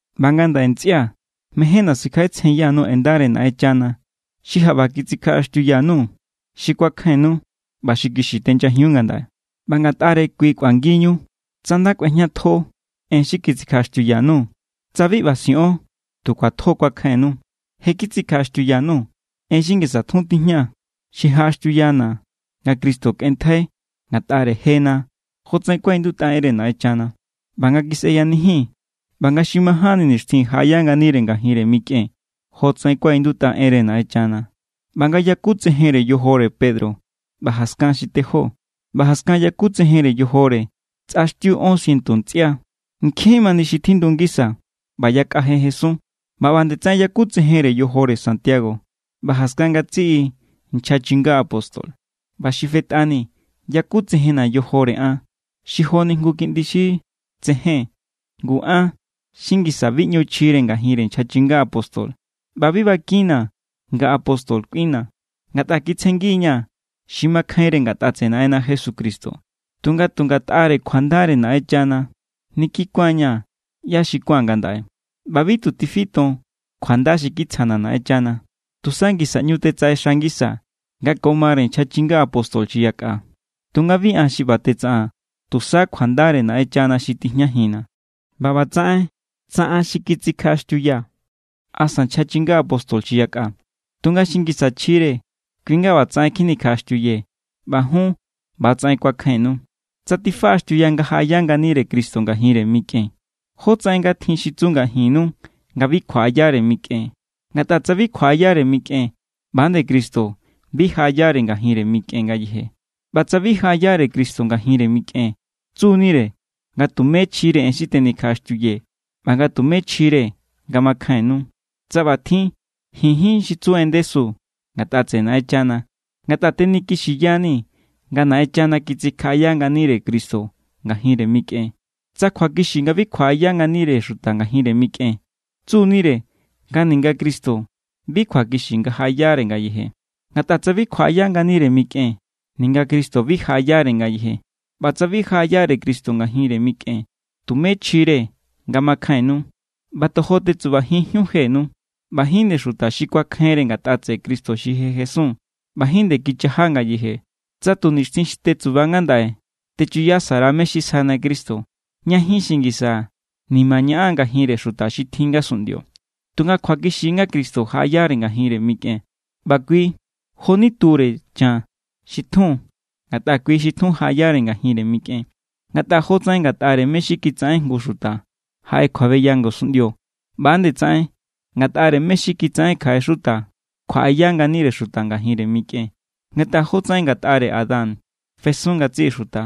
ꞌBa ngandaꞌe ntsꞌia̱, mejénna̱ sikjaꞌetsjenya_nuu̱ en ndare Naꞌenchana xi jaꞌba kitsikjaꞌaxtiuya_nuu̱, xi kuakjainnu ꞌba xi kixi tenyajiun ngandaꞌe. ꞌBa Ngatꞌare= kui kꞌuangi=ñu tsa nda kꞌuejñatjo en xi kitsikjaꞌaxtiuya_nuu̱, tsa bi ꞌba siꞌon tu kjuatjo= kuakjainnu. Je kitsikjaꞌaxtiuya_nuu̱ en xi ngisa tjun tijña xi jaꞌaxtiuyana̱ nga Cristo kꞌenntjai ngatꞌare jena jotsaꞌen kuaꞌindutꞌa enre Naꞌenchana, ꞌba nga kisꞌeyanijin, ꞌba nga xi majánni nixtjin jaꞌaya nganire ngajinre mikꞌen jotsaꞌen kuaꞌindutꞌa enre Naꞌenchana, ꞌba nga yakutsejenre yojore Pedro ꞌba jaskan xi tejó. ꞌBa jaskan yakutsejenre yojore tsꞌaxtiu ón sientu ntsꞌia. Nkjin mani xi tjindu ngisa, ꞌba yakꞌa je jesun. ꞌBa ꞌba nde tsaꞌen yakutsejenre yojore Santiago ꞌba jaskan ngatsiꞌi nchja chinga apóstol. ꞌBa xi fetꞌani yakutsejenna̱ yojore an xi joni jngu kiꞌndi xi tsején. Ngu an xi ngisa bi ꞌñu chjire ngajinre nchja chinga apóstol ꞌba bi bakinna̱ nga apóstol kꞌuinna̱, ngatꞌa kitsjengi=ña̱ xi makjainre ngatꞌa tseꞌe Naꞌenna Jesucristo. Tunga tu ngatꞌare kjuandare Naꞌenchana= nini kuán=ña̱ ꞌyá xi kuáa̱n ngandaꞌe. ꞌBa bi tu tifiton kjuanda xi kitsjana̱ Naꞌenchana. Tusa ngisa ꞌñu tetsaꞌexa ngisaa̱ nga ko mare nchja chinga apóstol xi yakꞌa. Tunga bi an xi ꞌba tetsaꞌaa̱n, tusa kjuandare Naꞌenchana xi tijñajinna̱. ꞌBa ꞌbatsaꞌen tsa an xi kitsikjaꞌaxtiuyaa̱ asa nchja chinga apóstol xi yakꞌa; tunga xi ngisa chjire kui nga ꞌbatsaꞌen kjinikjaꞌaxtiuyee̱, ꞌba jun ꞌba=tsaꞌen kuakjainnu. Tsa tifaꞌaxtiuya nga jaꞌaya nganire Cristo ngajinre mikꞌen, ¿jótsaꞌen nga tjin xi tsu ngajinnu nga bi kjuaꞌayare mikꞌen? Ngatꞌa tsa bi kjuaꞌayare mikꞌen, ꞌba nde Cristo bi jaꞌayare ngajinre mikꞌen ngayeje. ꞌBa tsa bi jaꞌayare Cristo ngajinre mikꞌen, tsu=nire nga tumé chjire en xi tenikjaꞌaxtiuyee̱ ꞌba nga tumé chjire nga makjainnu. Tsa ꞌba tjin, ji̱n jín xi tsu en ndesu ngatꞌa tseꞌe Naꞌenchana, ngatꞌa tenikixiyanii̱ nga Naꞌenchana kitsikjaꞌaya nganire Cristo ngajinre mikꞌen. Tsa kjuakixi nga bi kjuaꞌaya nganire xuta ngajinre mikꞌen, tsu=nire nga ninga Cristo bi kjuakixi nga jaꞌayare ngayeje. Ngatꞌa tsa bi kjuaꞌaya nganire mikꞌen, ninga Cristo bi jaꞌayare ngayeje. ꞌBa tsa bi jaꞌayare Cristo ngajinre mikꞌen, tumé chjire nga makjainnu. ꞌBa tojo tetsubajinjíun jenu. ꞌBa jín nde xuta xi kuakjainre ngatꞌa tseꞌe Cristo xi je jesun ꞌba jín nde kichaja ngayeje. Tsa tu nixtjin xi tetsuba ngandaꞌe techuyasa_ra mé= xi sjana Cristo, ña jín xi ngisa nima ñaꞌan ngajinre xuta xi tjin ngasunꞌndio. Tunga kjuakixi= nga Cristo jaꞌayare ngajinre mikꞌen. ꞌBa kui joni ture chan xi tjun, ngatꞌa kui xi tjun jaꞌayare ngajinre mikꞌen. Ngatꞌa jotsaꞌen ngatꞌare mé= xi kitsaꞌen jngu xuta jaꞌe kjuabeya ngasunꞌndio, ꞌba=nde tsaꞌen ngatꞌare mé= xi kitsaꞌen kjaꞌe xuta kjuaꞌaya nganire xuta ngajinre mikꞌen. Ngatꞌa jotsaꞌen ngatꞌare Adán fesun ngatsiꞌi xuta,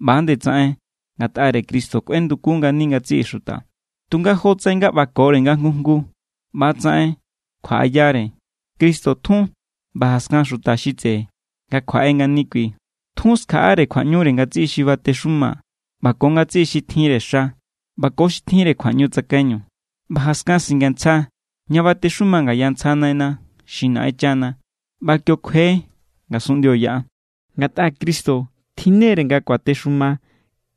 ꞌba=nde tsaꞌen ngatꞌare Cristo kꞌuendukun ngani ngatsiꞌi xuta. Tunga jotsaꞌen nga ꞌbakore nga jngu jngu ꞌba=tsaꞌen kjuaꞌayare: Cristo tjun ꞌba jaskan xuta xi tseꞌe nga kjuaꞌe ngani kui. Tjun skjaꞌare kjuaꞌñure ngatsiꞌi xi batexuma ꞌba ko ngatsiꞌi xi tjinre xa ꞌba ko xi tjinre kjuaꞌñu tsakaiñu, ꞌba jaskan singantsja ña batexuma ngaya ntsja Naina xi Naꞌenchana, ꞌba kio kjue ngasunꞌndio yaꞌa. Ngatꞌa Cristo tjinnere nga kuatexumare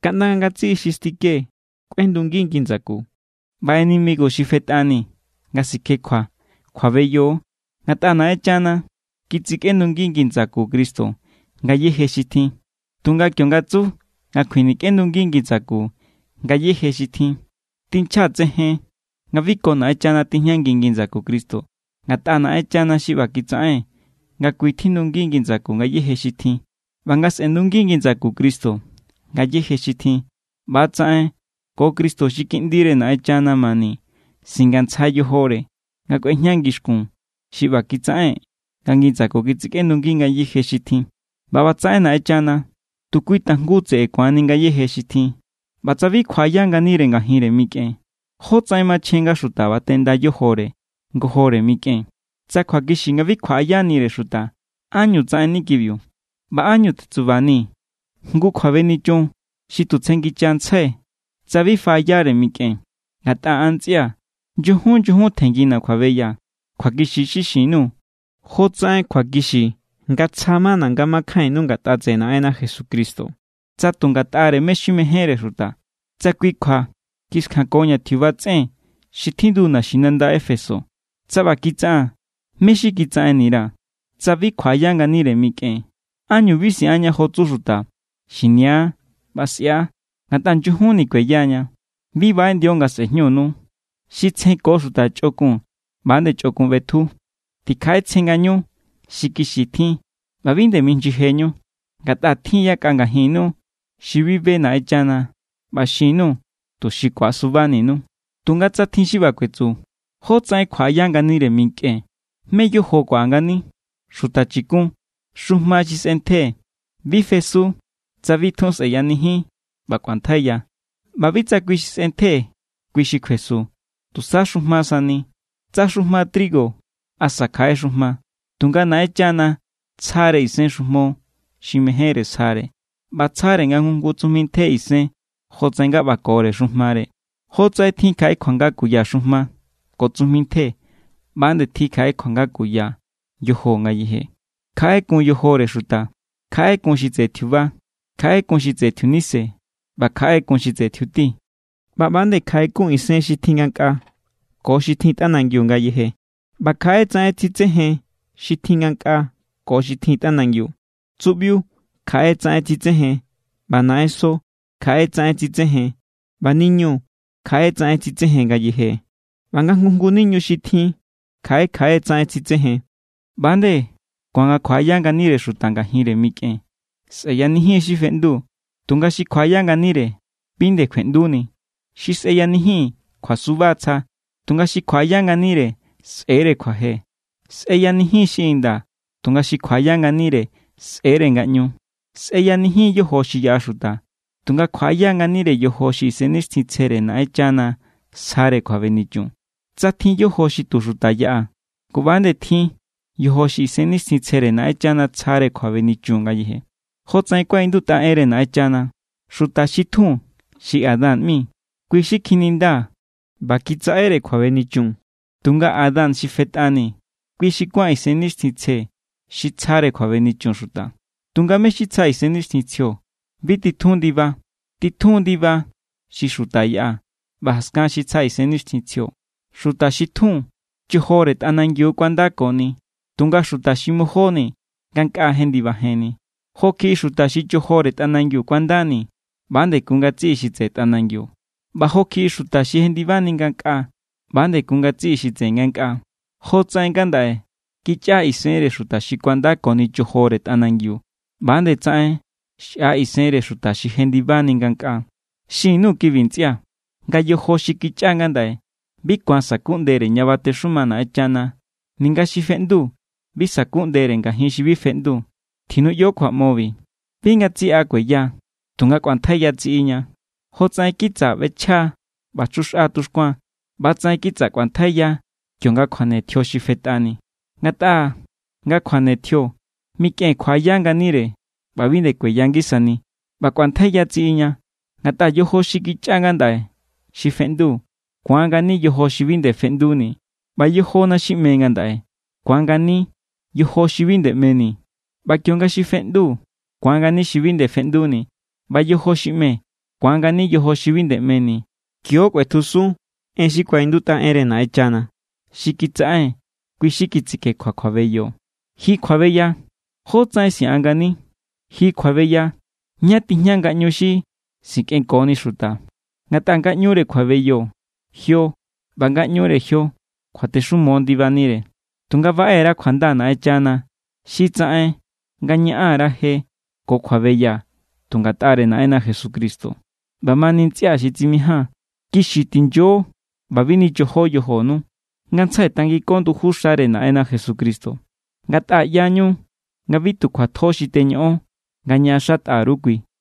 kaꞌnda nga ngatsiꞌi xi stike kꞌuendungi ngi ndsaku. ꞌBa enemigo xi fetꞌani nga sikjekjua, kjuabeyo. Ngatꞌa Naꞌenchana kitsikꞌendungi ngi ndsaku Cristo ngayéje xi tjin. Tunga kionga tsu nga kjinikꞌendungi ngi ndsaku ngayéje xi tjin, tinchja tsejen nga bi ko Naꞌenchana tijñangi ngi ndsaku Cristo, ngatꞌa Naꞌenchana xi ꞌba kitsaꞌen nga kui tjindungi ngi ndsaku ngayéje xi tjin. ꞌBa nga sꞌe̱ndungi ngi ndsaku Cristo ngayéje xi tjin, ꞌba=tsaꞌen ko Cristo xi Kiꞌndire Naꞌenchana mani singantsja yojore nga kꞌuejña ngixkun xi ꞌba kitsaꞌen nga ngi ndsaku kisꞌendungi ngayéje xi tjin. ꞌBa ꞌbatsaꞌen Naꞌenchana tu kui tajngu tseꞌe ku̱anni ngayéje xi tjin. ꞌBa tsa bi kjuaꞌaya nganire ngajinre mikꞌen, ¿jótsaꞌen machjen nga xuta batenda yojore ngojore mikꞌen? Tsa kjuakixi nga bi kjuaꞌayanire xuta, ¿ánñu tsaꞌenni kibiu? ꞌBa ¿ánñu tetsubanii̱ jngu kjuabenichun xi tu tsjenngichantsjai̱ tsa bi faꞌayare mikꞌen? Ngatꞌa an ntsꞌia̱, nyujun nyujun tjenngina̱ kjuabeya. Kjuakixi= xi xin_nuu̱ jotsaꞌen kjuakixi nga tsja= mana̱ nga makjainnu ngatꞌa tseꞌe Naꞌenna Jesucristo. Tsa tu ngatꞌare mé= xi mejénre xuta, tsa kui kjua kiskjankoña̱ tjiuba tsꞌen xi tjindu naxinanda Éfeso, tsa ꞌba kitsaꞌaa̱n, ¿mé= xi kitsaꞌenni_ra̱? Tsa bi kjuaꞌaya nganire mikꞌen, ¿ánñu bi siꞌanña jo tsu xuta: “Xinia ꞌba sꞌia, ngatꞌa nyujunni kueyaña”? Bi baꞌeꞌndio nga sꞌe̱jñunu. “Xi tsjenko xuta chꞌokun, ꞌba=nde chꞌokun ꞌbetju.” Tikjaꞌetsjen ngañu xi kixi tjin ꞌba bi nde minyijeñu. Ngatꞌa tjin= yakꞌa ngajinnu xi bi be Naꞌenchana. ꞌBa xin_nuu̱, tuxi ku̱asubaninu. Tunga tsa tjin xi ꞌba kuetsu: “¿Jótsaꞌen kjuaꞌaya nganire mikꞌen? ¿Mé= yojo xi kuaꞌa ngani?” ¡Xuta chikun! Xujma xi sꞌentje bi fesu tsa bi tjun sꞌeyanijin ꞌba kꞌuantjaiya. ꞌBa bi tsa kui xi sꞌentje kui xi kjuesu, tusa xujma sani, tsa xujma trigo asa kjaꞌe xujma. Tunga Naꞌenchana tsjare isen xujmo xi mejénre sjare, ꞌba tsjare nga jngu tsujmi ntje isen jotsaꞌen nga ꞌbakore xujmare. Jotsaꞌen tjin kjaꞌe kjuanga kuya xujma ko tsujmi ntje, ꞌba=nde tjin kjaꞌe kjuanga kuya yojo ngayeje. Kjaꞌe= kun yojore xuta, kjaꞌe= kun xi tseꞌe tjiuba, kjaꞌe= kun xi tseꞌe tjiunise, ꞌba kjaꞌe= kun xi tseꞌe tjiuti. ꞌBa ꞌba=nde kjaꞌe kun isen xi tjin ngankꞌaa ko xi tjin tꞌanangiu ngayeje, ꞌba kjaꞌe tsaꞌen tsitsejen xi tjin ngankꞌaa ko xi tjin tꞌanangiu. Tsuꞌbiu kjaꞌe tsaꞌen tsitsejen, ꞌba naꞌenso kjaꞌe tsaꞌen tsitsejen, ꞌba niñu kjaꞌe tsaꞌen tsitsejen ngayeje. ꞌBa nga jngu jngu niñu xi tjin kjaꞌe kjaꞌe tsaꞌen tsitsejen. ꞌBa=nde ku̱an nga kjuaꞌaya nganire xuta ngajinre mikꞌen. Sꞌeyanijin= xi feꞌndu, tunga xi kjuaꞌaya nganire bi nde kjueꞌnduni. Xi sꞌeyanijin kjuasuba tsja, tunga xi kjuaꞌaya nganire sꞌe̱=re kjuaje. Sꞌeyanijin= xi inda, tunga xi kjuaꞌaya nganire sꞌe̱=re ngaꞌñu. Sꞌeyanijin= yojo xi yaꞌa xuta, tunga kjuaꞌaya= nganire yojo xi Isennixtjintsjere Naꞌenchana sjare kjuabenichun. Tsa tjin yojo xi tu xuta yaꞌa, ngu, ꞌba=nde tjin yojo xi Isennixtjintsjere Naꞌenchana tsjare kjuabenichun ngayeje. Jotsaꞌen kuaꞌindutꞌa enre Naꞌenchana: “Xuta xi tjun xi Adán ꞌmi, kui xi kjininda ꞌba kitsaꞌere kjuabenichun.” Tunga Adán xi fetꞌani, kui xi kuán Isennixtjintsje xi tsjare kjuabenichun xuta. Tunga mé= xi tsja Isennixtjintsjio bi titjun ndiba, titjun= ndiba xi xuta yaꞌa, ꞌba jaskan xi tsja Isennixtjintsjio. Xuta xi tjun chojore tꞌanangiu kuandakoni, tunga xuta xi majóni ngankꞌaa jendibajenni. Jo kjiꞌi xuta xi chojore tꞌanangiu kuandakoni, ꞌba=nde kun ngatsiꞌi xi tseꞌe tꞌanangiu. ꞌBa jo kjiꞌi xuta xi jendibajenni ngankꞌaa, ꞌba=nde kun ngatsiꞌi xi tseꞌe ngankꞌaa. Jotsaꞌen ngandaꞌe kichꞌa= isenre xuta xi kuandakoni chojore tꞌanangiu, ꞌba=nde tsaꞌen xꞌa= isenre xuta xi jendibajenni ngankꞌaa. Xin_nuu̱ kibi, ntsꞌia̱, nga yojo xi kichꞌa ngandaꞌe bi ku̱an sa̱kuꞌndere ña batexuma Naꞌenchana. Ninga xi feꞌndu bi sa̱kuꞌndere ngajinre xi bi feꞌndu. Tjinuꞌyo kjuaꞌmobi. Bi ngatsiꞌa kueya, tunga kꞌuantjaiya tsiꞌiña. Jotsaꞌen kitsa ꞌbechja ꞌba chjuxꞌa tuxkuan, ꞌba=tsaꞌen kitsa kꞌuantjaiya kionga kjuane tjio xi fetꞌani. Ngatꞌa nga kjuane tjio, mikꞌen kjuaꞌaya nganire ꞌba bi nde kueya ngisani, ꞌba kꞌuantjaiya tsiꞌiña. Ngatꞌa yojo xi kichꞌa ngandaꞌe xi feꞌndu, ku̱an ngani yojo xi bi nde feꞌnduni. ꞌBa yojona xi ꞌme ngandaꞌe, ku̱an ngani yojo xi bi nde ꞌmeni. ꞌBa kionga xi feꞌndu ku̱an ngani xi bi nde feꞌnduni, ꞌba yojo xi ꞌme ku̱an ngani yojo xi bi nde ꞌmeni, kio= kꞌuetjusun en xi kuaꞌindutꞌa enre Naꞌenchana: “Xi kitsaꞌen, kui xi kitsikjekjua kjuabeyo. ¡Ji kjuabeya! ¿Jótsaꞌen siꞌan ngani? ¡Ji kjuabeya! ¿Ñá tijña ngaꞌñu xi sikꞌenkoni xuta?” Ngatꞌa ngaꞌñure kjuabeyo, jio. ꞌBa ngaꞌñure jio kjuatexumo ndibanire. Tunga baꞌe_ra kjuanda Naꞌenchana xi tsaꞌen nga ñaꞌan_ra je ko kjuabeya tu ngatꞌare Naꞌenna Jesucristo. ꞌBamani, ntsꞌia̱ xi tsimijaa̱n, kixi tinyo ꞌba bi nichojo yojonu. Ngantsjai tangiko nduju xare Naꞌenna Jesucristo, ngatꞌa ꞌyañu nga bi tu kjuatjo xi teñoꞌon nga ñaꞌaxatꞌa_ru kui.